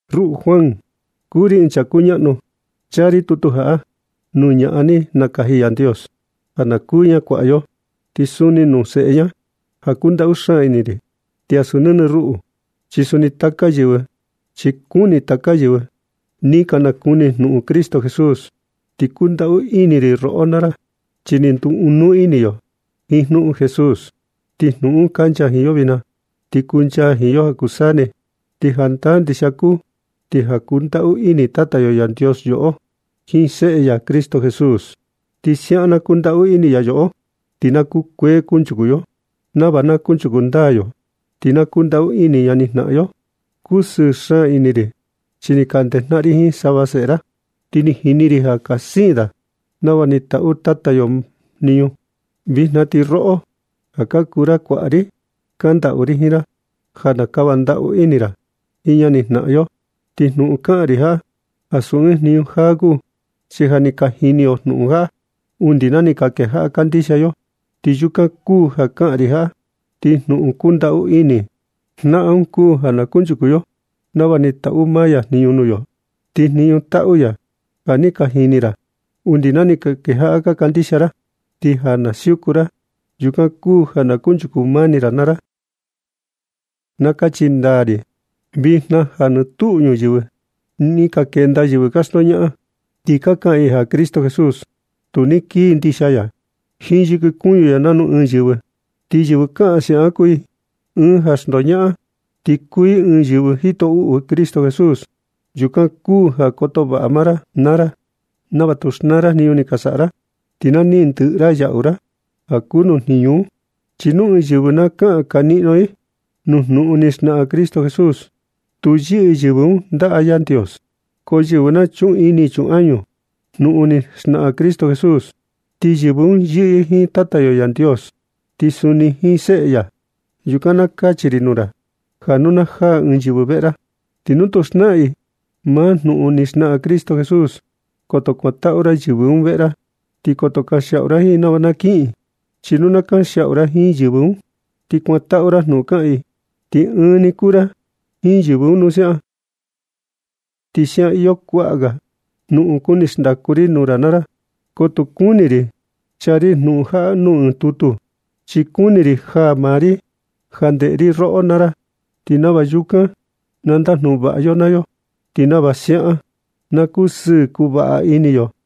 Ruꞌu Juan, kuu ri ɨɨn chaa kuñaꞌnu, chaa ri tutu jaꞌa nuu ñaꞌan ni nakaji Yandios ja na kuu ña kuaꞌa yo, ti suni nuu seꞌe ña, ja kundaꞌu xaan ini ri. Ti ansu nɨnɨ ruꞌu, chi kuni taka yɨvɨ ni ka nakuni jnuꞌun Cristo Jesús. Ti kundaꞌu ini ri roꞌo naa ra, chi ni nduu ɨɨn nuu ini yo jiin jnuꞌun Jesús, ti jnuꞌun un kancha jiin yo vijna, ti kuncha jiin yo ja kuu saa ni. Chi jandaa ndixia kuu ja kundaꞌu ini Tata yo Yandios yoꞌo jiin Seꞌe ya Cristo Jesús. Ti siaꞌan na kundaꞌu ini ya yoꞌo ti na kukuee kunchuku yo. Nava na kunchuku ndaa yo, ti na kundaꞌu ini jnaꞌan yo. Kusɨɨ xaan ini ri chi ni ka ndejnaꞌan ri jiin sava seꞌe ra, ti ni jini ri ja ka siin da nava ni taꞌu maa Tata yo Yandios jniñu. Vijna ti roꞌo, ja kuu ra kuaꞌa ri, kandaꞌu ri jiin ra ja na kava ndaꞌu ini ra jiin ñani jnaꞌan yo, ti jnuꞌun kaꞌan ri jaꞌa, ansu ɨɨn jniñu jaa kuu, chi ja ni ka jini yo jnuꞌun jaꞌa undi na ni ka kejaꞌa kandixia yo. Ti yukan kuu ja kaꞌan ri jaꞌa. Ti jnuꞌun kundaꞌu ini, jnaꞌan un kuu ja na kunchuku yo nava ni taꞌu maa ya jniñu nuu yo. Ti jniñu taꞌu ya un ja ni ka jini ra undi na ni ka kejaꞌa ka kandixia ra. Ti ja na siuku ra, yukan kuu ja na kunchuku mani ra naa ra. Na kachi ndaa ri vijna ja nɨ tuꞌu nuu ñuyɨvɨ ni ka kenda yɨvɨ ka xndoñaꞌan, ti ka kaꞌan i ja Cristo Jesús tu ni kii ndixia ya jiin yɨkɨ kuñu ya nanu ɨɨn yɨvɨ. Ti yɨvɨ kaꞌan siaꞌan kuu i ɨɨn ja xndoñaꞌan, ti kuu i ɨɨn yɨvɨ jito uꞌu Cristo Jesús. Yukan kuu ja koto vaꞌa maa ra naa ra nava tu xnaa ra jniñu ni ka saꞌa ra, ti na niꞌin ndɨꞌɨ ra yaꞌu ra ja kuu nuu jniñu un. Chi nu ɨɨn yɨvɨ na kaꞌan kaniꞌno i nuu jnuꞌun ni xnaꞌan Cristo Jesús, tu yɨꞌɨ yɨvɨ un ndaꞌa Yandios. Ko yɨvɨ na chuꞌun ini chun añu jnuꞌun ni xnaꞌan Cristo Jesús, ti yɨvɨ un yɨꞌɨ i jiin Tata yo Yandios, ti suni jiin Seꞌe ya. Yukan na kachi ri nuu ra, ja nu na jaa ɨɨn yɨvɨ veꞌe ra, ti nu tu xnaꞌan i maa jnuꞌun ni xnaꞌan Cristo Jesús, koto kuantaꞌu ra yɨvɨ un veꞌe ra, ni koto kanxiaꞌu ra jiin nava na kiꞌin. Chi nu na kanxiaꞌu ra jiin yɨvɨ un, ti kuantaꞌu ra jnuꞌun kaꞌan i, ti ɨɨn ni kuu ra jiin yɨvɨ un ja siaꞌan. Ti siaꞌan iyo kuaꞌa ga jnuꞌun kuni xndaku ri nuu ra naa ra, ko tu kuni ri chaa ri jnuꞌun jaꞌa nuu ɨɨn tutu, chi kuni ri jaa maa ri ja ndeꞌe ri roꞌo naa ra, ti nava yukan na ndajnuꞌun vaꞌa yo naa yo, ti nava siaꞌan na kusɨɨ kuu vaꞌa ini yo.